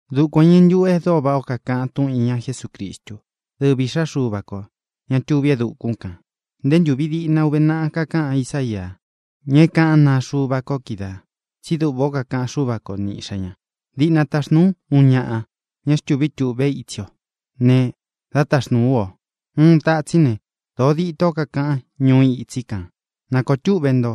Dukuān o iñɨ ntuꞌu e dóo váꞌā ó kakaꞌan túꞌun īña Jesúcristu, dɨ́vi Īꞌxá Xuva kō, ña tuví e dukún kān. Nté ntūvi diꞌna uve naꞌa kakaꞌan Ísaia, ña é kaꞌán naa Xuva ko kídaā, tsí duꞌvā ó kakaꞌan Xúva ko ni Iꞌxā ña: Diꞌna taxnūu ú uun ñaꞌa, ña é xtūví tuꞌvé itsi o, ne, dá taxnūu ú o. Uun tatsín ne, dōo ditó kakaꞌan ñuu itsí kān: “Nākoo túꞌvē ntó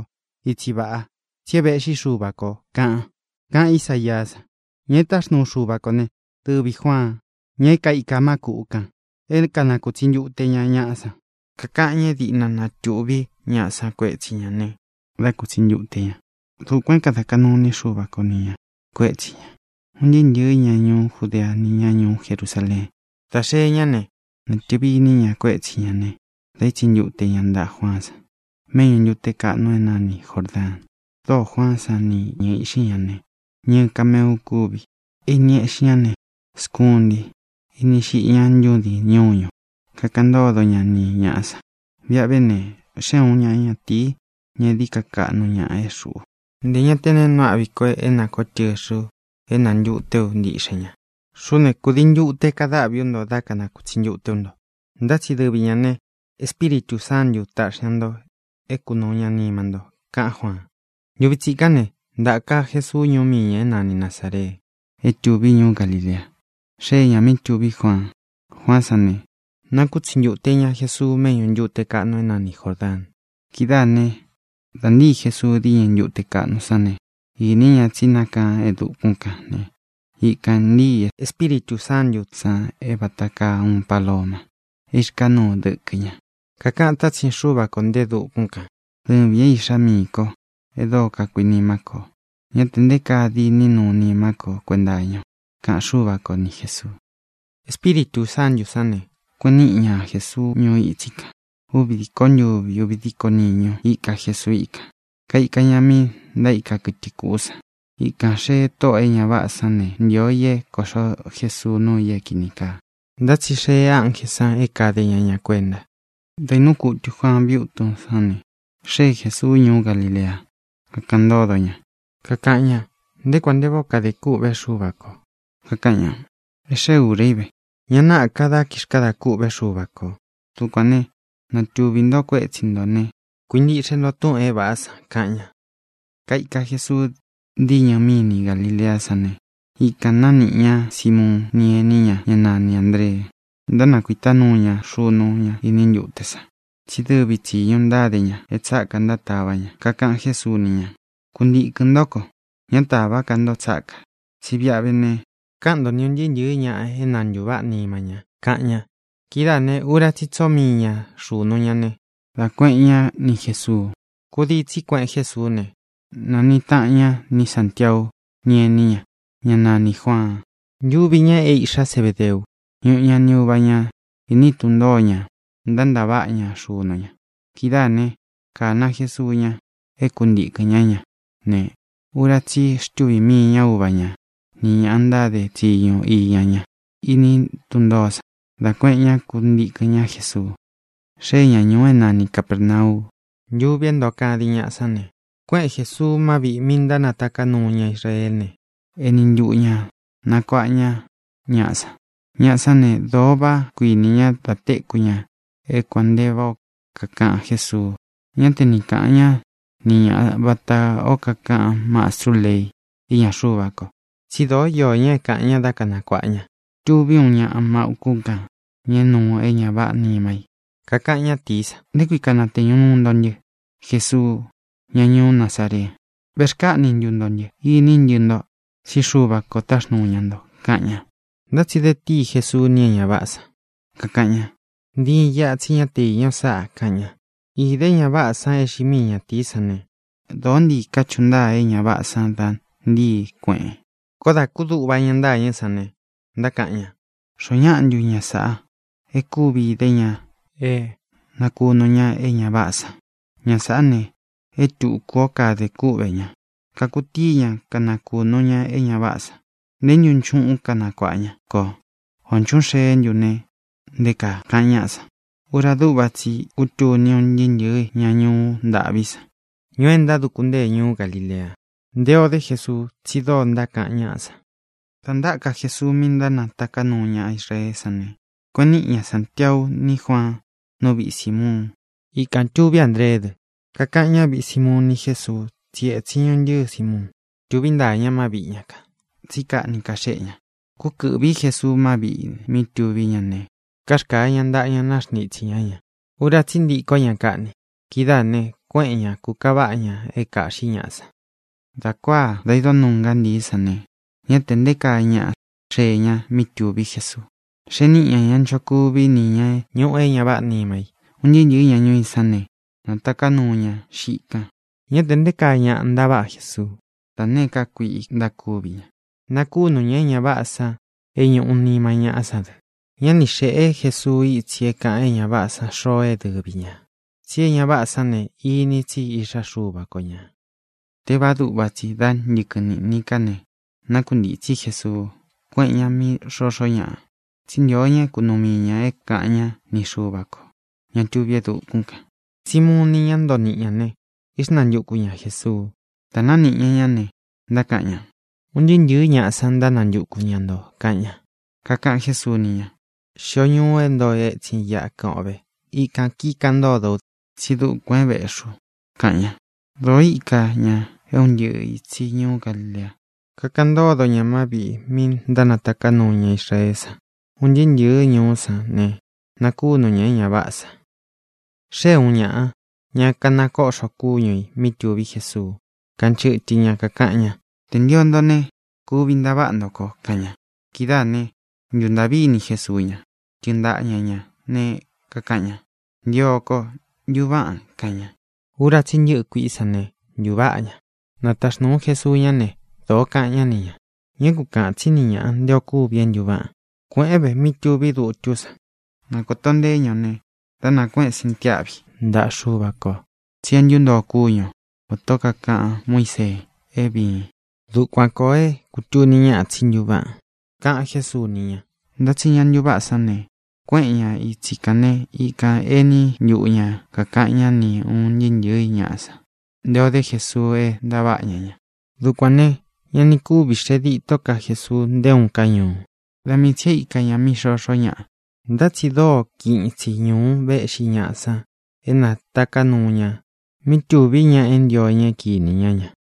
itsi vaꞌa, tsí e véꞌxi Xuva kō”, kaꞌan, kaꞌan Ísaia san. Ña é taxnuu Xuva kō ne, dɨvī Juaan, ña é kaika má kūꞌu kan é kanakūtsi ntute ña ñaꞌa san. Kakaꞌan ña é diꞌna natuꞌvi ñaꞌa san kuétsi ña ne, dá kutsi ntute ña. Dukuān é kāda kaꞌnu iní Xuva ko ni ñā kuetsí ña. Un ntɨɨ́ ntɨ̄ɨ́ ña ñuú Judea ni ñá ñuú Jerusaleén, dā xee ñá ne, natɨ̄vi iní ña kuetsi ña ne, da itsi ntute ña ntaꞌa Juaán san méꞌñu ntūte kaꞌnu é nani Jōrdaan. Dóō Juaán san ni ñɨ̄ɨ íꞌxi ña ne, ñɨɨ kameu kúvi. E ini éꞌxi ña ne, skunti; ini xiꞌi ñá ntūdín ñuñu. Kakaꞌan ntódo ña ni ñāꞌa san: —Viꞌi a vé ne, xée uun ñaꞌa ñatīi, ña é dií ka kaꞌnu ñaꞌa é xuꞌu. Ntē ña té nee nuu áꞌvi ko é nākoó tɨxɨ̄ u é nāntuté u ntiꞌxen ña. Xuꞌú ne, kūdii ntute kadáꞌvi ú nto dá kanakūtsi ntute ú nto. Ntá tsi dɨvi ñā ne, Espíritū Sántū taꞌxi ña nto é kunūu ña nima nto —kaꞌan Juaan. Ntuvi tsikán ne, ntaka Jesuú ñuú mii ñā é nani Nazāree, é tuví ñuú Galilea. Xée ñā mí tuví Juaan. Juaán san ne, nakútsi ntute ña Jesuu méꞌñu ntūte kaꞌnu é nani Jōrdaan. Kidáā né, dā ntíi Jesuu diñɨ ntute kaꞌnu san ne, īni ña tsí nákaan e dukún kan ne, ikān ntíi Espíritū Sántū san é vata kaa uun paloma é īrkaá nuu dɨkɨ ña. Kakaꞌan tátsin Xúva kō nte e dukún kān: —Dɨvīn é Iꞌxá miī ko e dóo kakuinimá ko o. Ñá te nté kaa diní nu nimá ko kuenta iña o —kaꞌan Xúva ko ni Jēsuu. Espíritū Sántū sán ne, kueꞌen níꞌi ña Jesuu ñuu itsí kān. Úvi dīkó ntuvi, úvi dīkó niñu íka Jesuu íkān. Kaika ña mí ntaíka kɨtɨ kuꞌu san. Ikān xée tóꞌō e ña váꞌā san ne, ntio i é kōꞌxo Jesuu núu i é kīni kaa. Ntá tsi xee ánjē san é kade ña ña kuenta. Dā inúu kutu Juaan viútun sán ne, xée Jēsuu ñuú Galilea, kakaꞌan ntódo ña, kakaꞌan ña nté kuān nte váꞌā ó kadē kûꞌvé Xuva kō. Kakaꞌan ña: —E xée ūra í ve. Ña náꞌā ka dá kixkadā kûꞌvé Xuva kō. Dukuān né, natuꞌvi ntó kuetsi nto ne, kuintiꞌxe nto túꞌūn é vāꞌá san —kaꞌan ña. Kaika Jesuu díñɨ míni Galileá san ne, ikān nániꞌi ña Simuun ni ení ña, ñá nani Āndree. Ntánakuītá nuu ña xunu ña iní ntute san, tsí dɨvi tsīñu ntáde ña é tsāká ntátava ña. Kakaꞌan Jésuu ni ña: —Kuntīkɨn ntó ko. Ñá tāvá ka nto tsákā, tsí viꞌi a vé ne, káꞌan nto ni ūn ntɨɨ́ ntɨ̄ɨ́ ñaꞌa é na ntūváꞌa nima ña —kaꞌan ña. Kidáā ne, ura tsí i tsoo mii ña xunu ña ne, dá kuēꞌen ñá ni Jēsuu. Kūdii tsi kuéꞌen Jesuú ne, nāniꞌi taꞌan ña ni Sántiau ni ení ña, ñá nanī Juaan. Ntuvi ña é īꞌxá Zebedeu. Ñuꞌu ña ni uva ñā iní tun ntoō ñá, ntántaváꞌa ña xunu ña. Kidáā né, kāna Jesuu ña é kuntīkɨn ñá ña ne, ura tsí i xtúvi mii ña uva ña nī ña ntáde tsiñu iña ña iní tun ntōó san, dá kuēꞌen ñá kuntīkɨn ñá Jesuu. Xée ña ñūu é nani Capērnau. Ntuvi é ntoo kadin ñaꞌa sán ne, kuéꞌen Jēsuu má viꞌī mi ntánataká nuu ña Israeé ne, eni ntuꞌu ñā nakuaꞌa ña ñaꞌá san. Ñaꞌa sán ne, dōo vaꞌá kuinī ñá da téku ña é kuān nte váꞌā ó kakaꞌan Jésuu. Ñá te ni kāꞌan ñá ni ña vatā ó kakaꞌan mastrú lei íña Xuva ko, tsi dóo iō ña é kāꞌan ña dá kanakuāꞌa ña. Tuví uun ñaꞌa má ūkún kān, ña é nuu e ña váꞌā nima i. Kakaꞌan ñátīí san: —¿Nté kui kānateñu nuu nto ntɨ́, Jesuu, ñá ñuú Nazaree? ¿Vēxkáꞌni ntu nto ntɨ? Iní ntɨ nto, tsí Xuva kō táxnūu ña nto —kaꞌan ña. Ntá tsi de tíi Jesuu ni é ña váꞌā san, kakaꞌan ña: —¡Ntiin iꞌa, tsí ña te íña o sáꞌā! —kaꞌan ña. Īde é ña váꞌā san é xiꞌi mii ñatīí san ne, dōó ntii kachuꞌu ntáa é ña váꞌā san da ntíi, kueꞌen. Koó dā kúduꞌva ña ntâñɨ́ san ne, ntákaꞌan ña: —¿Xoó ñaꞌa ntu ña sāꞌa e kúvi idé ña é nakūnu ña é ña váꞌā san? Ña sāꞌá ne, e túku o kadē kúꞌvē ña. Kakutíi ña kanakūnu ña é ña váꞌā san. ¿Né ntu nchuꞌún kanakuāꞌa ña kō? ¿Ō nchuꞌún xeé ntu, ne, nté kaa? —kaꞌan ñáꞌa san. Ura dúꞌva tsi i kútuni un ntɨɨ́ ntɨ̄ɨ́ ña ñuú ntaꞌvi san, ñuú e ntáduku ntée ñuú Galilea, nté ō dé Jesuu, tsí dóo ntákaꞌan ñáꞌa san. Dā ntáka Jesuu mí ntánataká nuu ña Israeé san ne, kueꞌen níꞌi ña Santiau ní Juaan nú viꞌi Sīmuun. Ikān tuví Andreé dɨ. Kakaꞌan ñáviꞌi Sīmuun ni Jésuu tsí etsin ñuntɨ́ɨ Sīmuun. Tuví ntaa ña má viꞌi ña kān, tsí kaꞌni kaxéꞌe ña. Kúkɨ̄ꞌví Jesuu má viꞌī mí tuví ña ne, karkāa ña ntaꞌa ña, náxntitsī ñá ña. Ura tsí i ntikó ña kaꞌni. Kidáā ne, kuéꞌen ña, kūkaváꞌa ña é kāꞌxí ñaꞌa san. Dā kuáā, da idó nuu ngántii sán ne, ñá tē nté kaa ñaꞌa xee ña mí tuví Jesuu, xee níꞌi ña ña nchokuví ni ñā é ñuꞌu é ña váꞌā nima i. Un ntɨɨ́ ntɨ̄ɨ́ ña ñuu í san ne, nātaká nuu ña xiꞌi kan. Ñá tē nté kaa ñaꞌa ntaváꞌa Jesuú da nēé ka kuiꞌi ntákuvi ña. Nakúnu ñā é ña váꞌā san é ñūꞌu nima ñáꞌa san dɨ. Ñá ni xēꞌé Jesuu itsi é kāꞌan é ña váꞌā san xoo é dɨvi ñā, tsí e ña váꞌā san ne, ini tsí Iꞌxá Xuva ko ñā. Tévāá duꞌva tsi, dá ntɨkɨn niꞌnī ká ne, nákuntītsí Jesuu, kuéꞌen ñā mí xoxó ñaꞌa, tsí ntio ña é kunuu mii ñā é kāꞌan ñá ni Xuva kō, ña tuví e dukún kān. Simuun ni ñá ntoo niꞌi ñā ne, íxnantuku ña Jēsuu. Dā nániꞌi ña ñá ne, ntákaꞌan ña: —Un ntɨɨ́ ntɨ̄ɨ́ ñaꞌa san ntánantuku ña ntō —kaꞌan ña. Kakaꞌan Jésuu ni ña: —Xio ñuu é ntoo etsin iꞌa kɨꞌɨn o ve. Ikān kíkaꞌan ntódo ú dɨ, tsí dukuān é vēꞌxi u —kaꞌan ña. Dōo íka ña é un ntɨꞌɨ ītsi ñuú Galilea. Kakaꞌan ntódo ña má viꞌī mi ntánataká nuu ña Israeé san un ntɨɨ́ ntɨ̄ɨ́ ñuú san ne, nakūnu ña é ña váꞌā san. Xée ūun ñaꞌa, ña kanakoꞌxo kúñu ī, mí tuví Jesuu. Kanchɨtɨ ña, kakaꞌan ña: —Tē ntio nto ne, kuvi ntaváꞌa nto ko —kaꞌan ña. Kidáā ne, ntuntaꞌví ini Jesuu ña. Tɨɨn ntaꞌa ña ñā ne, kakaꞌan ña: —Ntio ko. Ntuváꞌan —kaꞌan ña. Ura tsí i ntɨ́ꞌɨ kuiꞌí san ne, ntuváꞌa ña. Nataxnūu Jesuu ñá ne, dōo kaꞌan ñá ni ñā: —Ñá ku kāꞌan tsín ni ñāꞌa nté ō kúvi é ntuváꞌan. Kuēꞌén ve mí tuví dutú san, na kōto nteé ña o ne, dá nakuēꞌen sintiáꞌvi ntaꞌa Xuva kō tsi é ntuntoo kúñu o, vatā ó kakaꞌan Muísee é vīin. Dukuan kōo é kūtuni ñáꞌa tsí ntuváꞌan —kaꞌan Jésuu ni ña. Ntá tsi ña ntuváꞌa sán ne, kuéꞌen ña itsi kān né, ikān éni ntuꞌu ña kākaꞌan ñá ni ūn ntɨɨ́ ntɨ̄ɨ́ ñaꞌa san nté ō dé Jesuu é ntaváꞌa ña ña. Dukuān ne, ña ni kúvi xee ditó ka Jesuu nté uun ká ñuu. Da mii tsī e íka ña mí xoxó ñaꞌa. Ntá tsi dóo kiꞌin itsi ñūu véꞌxi ñaꞌa san é nātaká nuu ña mí tuví ña é ntio ña kini ña ña.